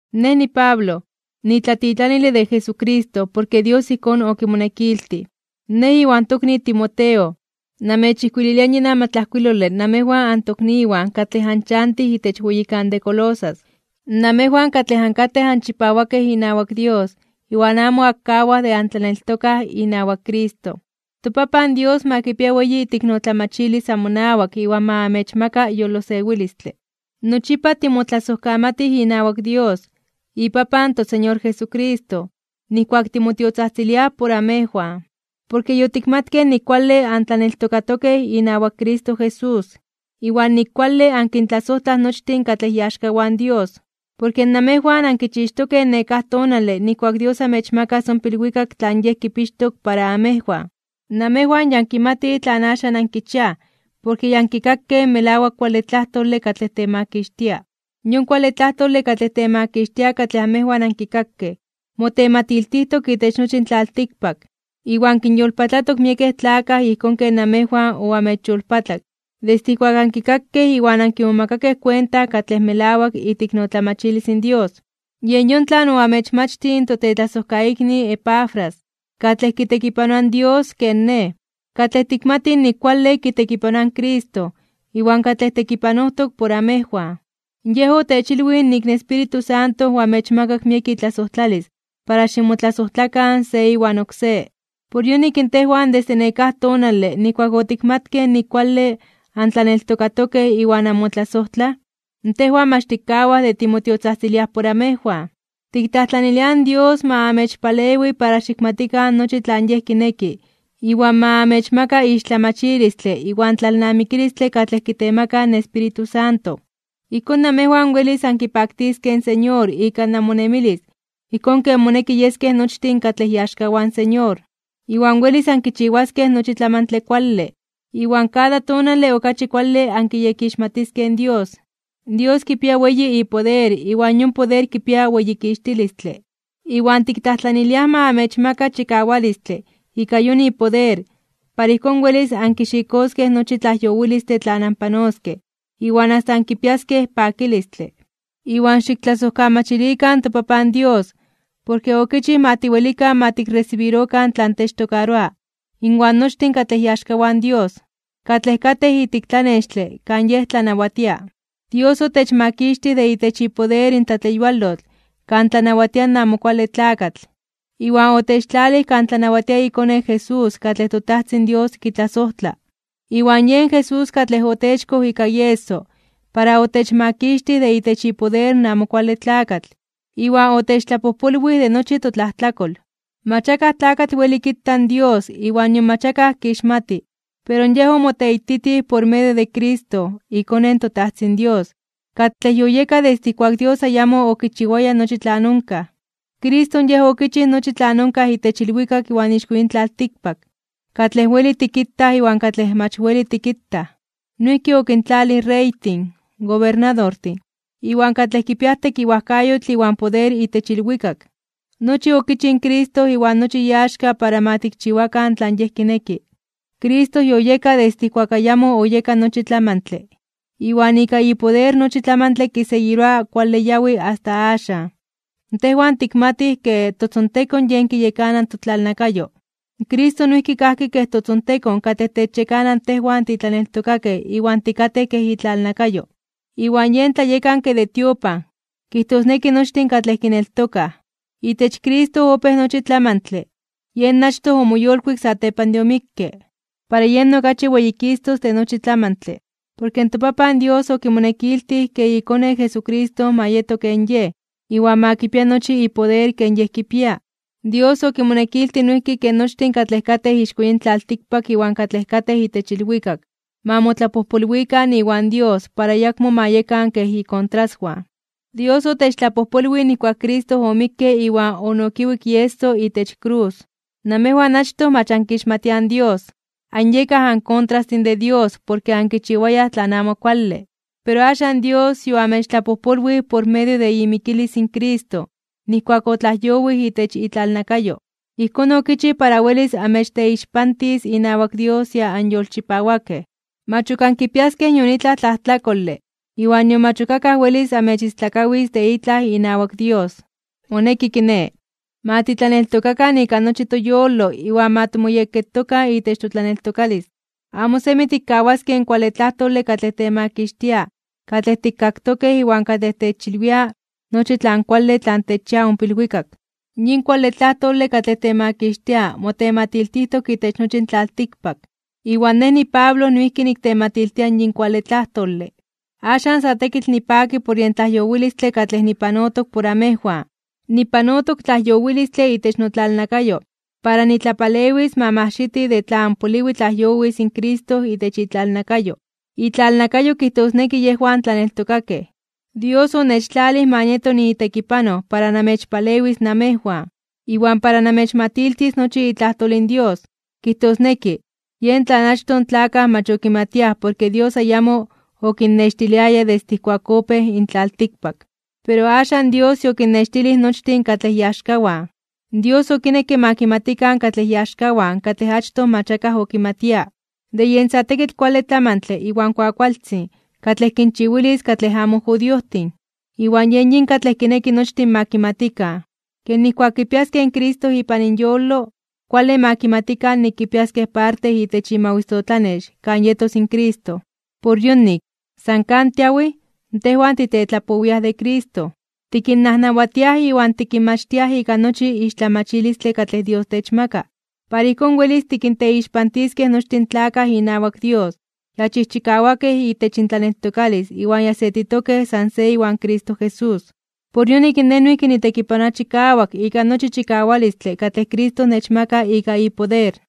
Nej niPablo, nitlatitlanile de Jesucristo porke Dios ijkón okimonekiltij. Nej iwan tokni Timoteo, namechijkuililia yin amatlajkuilole namejwan antokniwan katlej anchantij itech weyikan de Colosas, namejwan katlej ankatej anchipawakej inawak Dios iwan amo ankawaj de antlaneltokaj inawak Cristo. ToPapan Dios ma kipia weyi iteiknotlamachilis amonawak iwan ma amechmaka yolosewilistle. Nochipa timotlasojkamatij inawak Dios, iPapan toSeñor Jesucristo, nijkuak timotiotzajtziliaj por amejwan. Porke yotikmatkej nik kuale antlaneltokatokej inawak Cristo Jesús, iwan nik kuale ankintlasojtlaj nochtin katlej iaxkawan Dios. Porke namejwan ankichixtokej nekáj tonale nijkuak Dios amechmakas ompa ilwikak tlan Yej kipixtok para amejwan. Namejwan ya ankimatij tlan axan ankichiaj porke ya ankikakej in melawak kuale tlajtole katlej temakixtia. Yon kuale tlajtole katlej temakixtia katlej amejwan ankikakej, motematiltijtok itech nochi in tlaltikpak, iwan kinyolpatlatok miekej tlakaj ijkón ken namejwan oamechyolpatlak desde ijkuak ankikakej iwan ankimomakakej kuenta katlej melawak iteiknotlamachilis in Dios. Yen yon tlan oamechmachtij in totetlasojkaikni Epafras, katlej kitekipanoa in Dios ken nej, katlej tikmatij nik kuale kitekipanoa in Cristo iwan katlej tekipanojtok por amejwan. Yej otechilwij nik in Espíritu Santo oamechmakak miek itlasojtlalis para ximotlasojtlakan se iwan oksé. Por yonik tejwan desde nekáj tonale nijkuak otikmatkej nik kuale antlaneltokatokej iwan anmotlasojtlaj, tejwan mach tikkawaj de timotiotzajtziliaj por amejwan. Tiktlajtlaniliaj in Dios ma amechpalewi para xikmatikan nochi tlan Yej kineki iwan ma amechmaka ixtlamachilistle iwan tlalnamikilistle katlej kitemaka in Espíritu Santo. Ijkón namejwan welis ankipaktiskej in Señor ika namonemilis ijkón ken moneki yeskej nochtin katlej iaxkawan Señor. Iwan welis ankichiwaskej nochi tlamantle tlan kuale, iwan kada tonale okachi kuale ankiyekixmatiskej in Dios. Dios kipia weyi ipoder iwan yon poder kipia weyikixtilistle, iwan tiktlajtlaniliaj ma amechmaka chikawalistle ika yon ipoder para ijkón welis ankixikoskej nochi tlajyowilistle tlan anpanoskej iwan asta ankipiaskej pakilistle. Iwan xiktlasojkamachilikan in toPapan Dios, porke okichij ma tiwelikan ma tikresibirokan tlan techtokaroa inwan nochtin katlej iaxkawan in Dios, katlej katej ijtik tlanextle kan Yej tlanawatia. Dios otechmakixtij de itech ipoder in tlatleyualotl kan tlanawatia in Amo Kuale Tlakatl, iwan otechtlalij kan tlanawatia iKone Jesús katlej toTajtzin Dios kitlasojtla. Iwan yen Jesús katlej otechkoj ika ieso para otechmakixtij de itech ipoder in Amo Kuale Tlakatl, iwan otechtlapojpolwij de nochi totlajtlakol. Mach akaj tlakatl weli kita in Dios iwan nion mach akaj kixmati, pero Yej omoteititij por medio de Cristo, iKone in toTajtzin Dios, katlej yoyeka desde ijkuak Dios ayamo okichiwaya nochi tlan onkaj. Cristo Yej okichij nochi tlan onkaj itech ilwikak iwan ixko yin tlaltikpak, katlej weli tikitaj iwan katlej mach weli tikitaj. Noijki okintlalij in reytin, gobernadortin, iwan katlej kipiaj tekiwajkayotl iwan poder itech ilwikak. Nochi okichij in Cristo iwan nochi iaxka para ma kichiwakan tlan Yej kineki. Cristo yoyeka desde ijkuak ayamo oyeka nochi tlamantle, iwan ika ipoder nochi tlamantle kiseguiroa kuale yawi asta axan. Tejwan tikmatij ke totzontekon yen kiyekana in totlalnakayo. Cristo noijki kajki kej totzontekon katlej techyekana tejwan titlaneltokakej iwan tikatej kej itlalnakayo. Iwan yen tlayekanke de tiopan, kijtosneki nochtin katlej kineltokaj. Itech Cristo opéj nochi in tlamantle, yen achtoj omoyolkuik satepan de omikke, para yen okachi weyikistos (weyititos) de nochi tlamantle. Porke in toPapan Dios okimonekiltij ke iKone Jesucristo ma yeto ken Yej, iwan ma kipia nochi ipoder ken Yej kipia. Dios okimonekiltij noijki ke nochtin katlej katej ixko yin tlaltikpak iwan katlej katej itech ilwikak, ma motlapojpolwikan iwan Dios para ayakmo ma yekan kej ikontraswan. Dios otechtlapojpolwij nijkuak Cristo omikke iwan onokiwik ieso itech krus. Namejwan achtoj mach ankixmatiaj in Dios, anyekaj ankontrastin de Dios porke ankichiwayaj tlan amo kuale. Pero axan Dios yoamechtlapojpolwij por medio de imikilis in Cristo nijkuak otlajyowij itech itlalnakayo. Ijkón okichij para welis amechteixpantis inawak Dios ya anyolchipawakej. Mach ok ankipiaskej nion itlaj tlajtlakole iwan nion mach ok akaj welis amechistlakawis de itlaj inawak Dios. Moneki kiné, ma titlaneltokakan ika nochi toyolo iwan ma timoyekketokan itech totlaneltokalis. Amo semi tikkawaskej in kuale tlajtole katlej temakixtia katlej tikkaktokej iwan katlej techilwia nochi tlan kuale tlan techchia ompa ilwikak. Yin kuale tlajtole katlej temakixtia motematiltijtok itech nochi in tlaltikpak, iwan nej niPablo noijki niktematiltia in yin kuale tlajtole. Axan sa tekitl nipaki por yen tlajyowilistle katlej nipanotok por amejwan. Nipanotok tlajyowilistle itech notlalnakayo para nitlapalewis ma moajxiti de tlan poliwi tlajyowis in Cristo itech itlalnakayo, itlalnakayo kijtosneki yejwan tlaneltokakej. Dios onechtlalij ma nieto niitekipanoj para namechpalewis namejwan, iwan para namechmatiltis nochi itlajtol in Dios, kijtosneki, yen tlan achtoj in tlakaj mach okimatiaj porke in Dios ayamo okinnextiliaya desde ijkuak opéj in tlaltikpak. Pero axan Dios yokinnextilij nochtin katlej iaxkawan. Dios okinekke ma kimatikan katlej iaxkawan katlej achtoj mach akaj okimatia, de yen sa tekitl kuale tlamantle iwan kuakualtzin katlej kinchiwilis katlej amo judiojtin. Iwan yen yin katlej kineki nochtin ma kimatikan: ke nijkuak kipiaskej in Cristo ipan inyolo, kuale ma kimatikan nik kipiaskej parte itech imawisotlanex kan yetos in Cristo. Por yonik, san kan tiawij, tejwan titetlapowiaj de Cristo. Tikinnajnawatiaj iwan tikinmachtiaj ika nochi ixtlamachilistle katlej Dios techmaka, para ijkón welis tikinteixpantiskej nochtin in tlakaj inawak Dios ya chijchikawakej itech intlaneltokalis iwan ya setitokej san se iwan Cristo Jesús. Por yonik nej noijki nitekipanoa chikawak ika nochi chikawalistle katlej Cristo nechmaka ika ipoder.